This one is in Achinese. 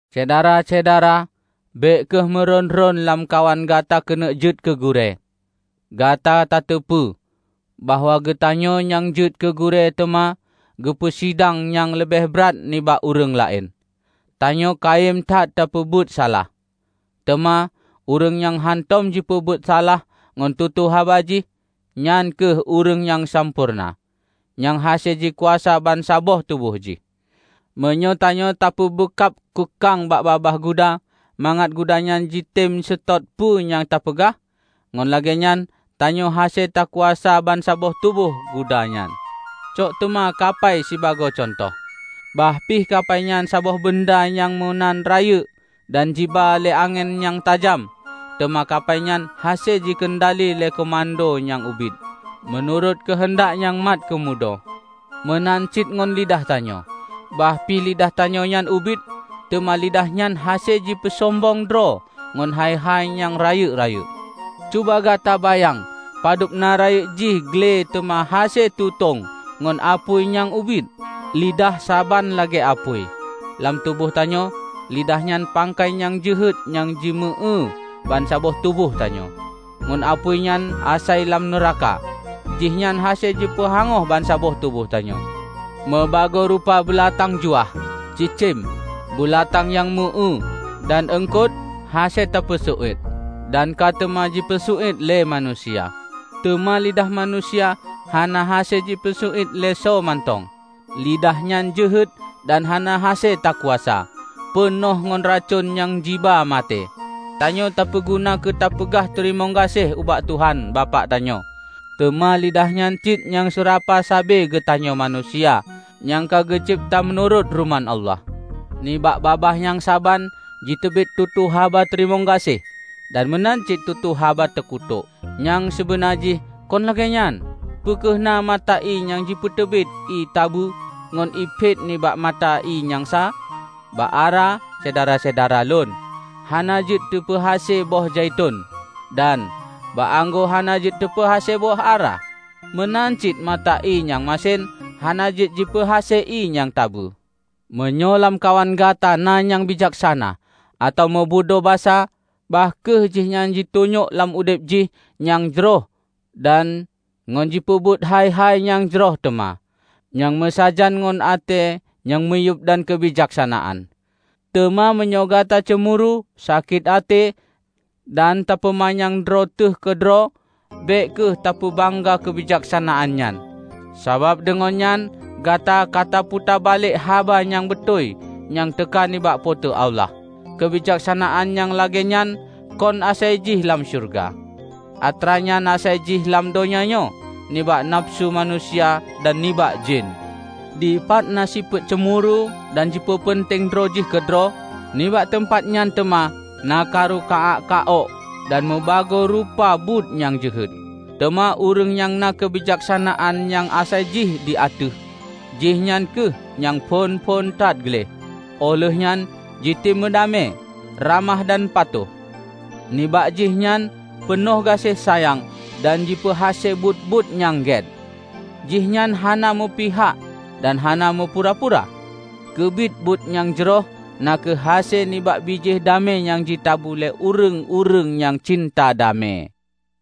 Syedara-syedara! Bék kheueh meuron-ron lamkawan gata keuneuk jeuet keu gurée. Gata tateupeue bahwa geutanyoe nyang jeuet keu gurée teuma geupeu sidang nyang leubeh brat nibak ureuëng laén. Tanyoe kayém that tapeubuet salah. Teuma ureuëng nyang hántom jipeubuet salah ngon tutoe haba jih, nyan kheueh ureuëng nyang sampoereuna, nyang hase jikuasa bansaboh tuboh jih. Meunyoe tanyoe tapeubeukab keukang bak babah guda mangat guda nyan jitem seutôt peue nyang tapeugah, ngon lagée nyan tanyoe hase takuasa bansaboh tuboh guda nyan. Cok teuma kapai sibagoe cuntoh. Bah pih kapai nyan saboh beunda nyang meunan rayeuk dan jiba lé angén nyang tajam, teuma kapai nyan hase jikeundali lé keumudo nyang ubit, meunurot keuheundak nyang mat keumudo. Meunan cit ngon lidah tanyoe; bah pi lidah tanyoe nyan ubit, teuma lidah nyan hase jipeusombong droe ngon hai-hai nyang rayeuk-rayeuk. Cuba gata bayang padub na rayeuk jih gle teuma hase tutong ngon apui nyang ubit! Lidah saban lagée apui. Lam tuboh tanyoe, lidah nyan pangkai nyang jeuhet nyang jimeu-éue bansaboh tuboh tanyoe. Ngon apui nyang asai lam nuraka, jihnyan hase jipeuhangoh bansaboh tuboh tanyoe. Mubagoe rupa beulatang juah, cicém, beulatang nyang meu éue dan eungkot hase teupeu seuiet, dan ka teuma ji peuseuit lé manusia. Teuma lidah manusia hana hase jipeuseu iet lé soe mantong. Lidah nyan jeuhet dan hana hase takuasa; peunoh ngon racon nyang jiba maté. Tanyoe tapeuguna keu tapeugah teurimong gaséh ubak Tuhan Bapak tanyoe, teuma lidah nyan cit nyang seurapa sabe geutanyoe manusia, nyang ka geucebta meunurot ruman Allah. Nibak babah nyang saban jiteubiet tutoe haba teurimong gaséh dan meunan cit tutoe haba teukutok. Nyang sibeuna jih kon lagée nyan! Peu kheueh na mata ié nyang jipeuteubiet ié tabeue ngon ié phet nibak mata ié nyang sa? Bak ara, Syedara-syedara lôn, hana jeuet jipeuhase boh zaiton, dan bak anggô hana jeuet jipeuhase boh ara. Meunan cit mata ié nyang masen hana jeuet jipeuhase ié nyang tabeue. Meunyoe lamkawan gata na nyang bijaksana atawa meubudoe basa, bah kheueh jihnyan jitunyok lam udeb jih nyang jroh dan ngon jipeubuet hai-hai nyang jroh teuma, nyang meusajan ngon até nyang miyueb dan keubijaksanaan. Teuma meunyoe gata ceumuru, sakét até, dan tapeumanyang droe teuh keudroe, bék kheueh tapeubangga keubijaksanaan nyan, sabab deungon nyan gata kataputa balek haba nyang beutôi nyang teuka nibak Po teu Allah. Keubijaksanaan nyang lagée nyan kon asai jih lam syeuruga. Atranyan asai jih lam donya nyoe, nibak nafeusu manusia, dan nibak jén! Dipat na sifeuet ceumuru dan jipeupeunteng droe jih keudroe, nibak teumpat nyan teuma na karu ka-ak ka ok dan meubagoe rupa buet nyang jeuhet. Teuma ureuëng nyang na keubijaksanaan nyang asai jih di ateueh, jihnyan kheueh nyang phon-phon that gleh, óh lheueh nyan jitem meudamé, ramah dan patuh. Nibak jihnyan peunoh gaséh sayang dan jipeuhase buet-buet nyang gét. Jihnyan hana meupihak dan hana meupura-pura. Keubiet buet nyang jroh na kheueh hase nibak bijéh damé nyang jitabu lé ureuëng-ureuëng nyang cinta damé.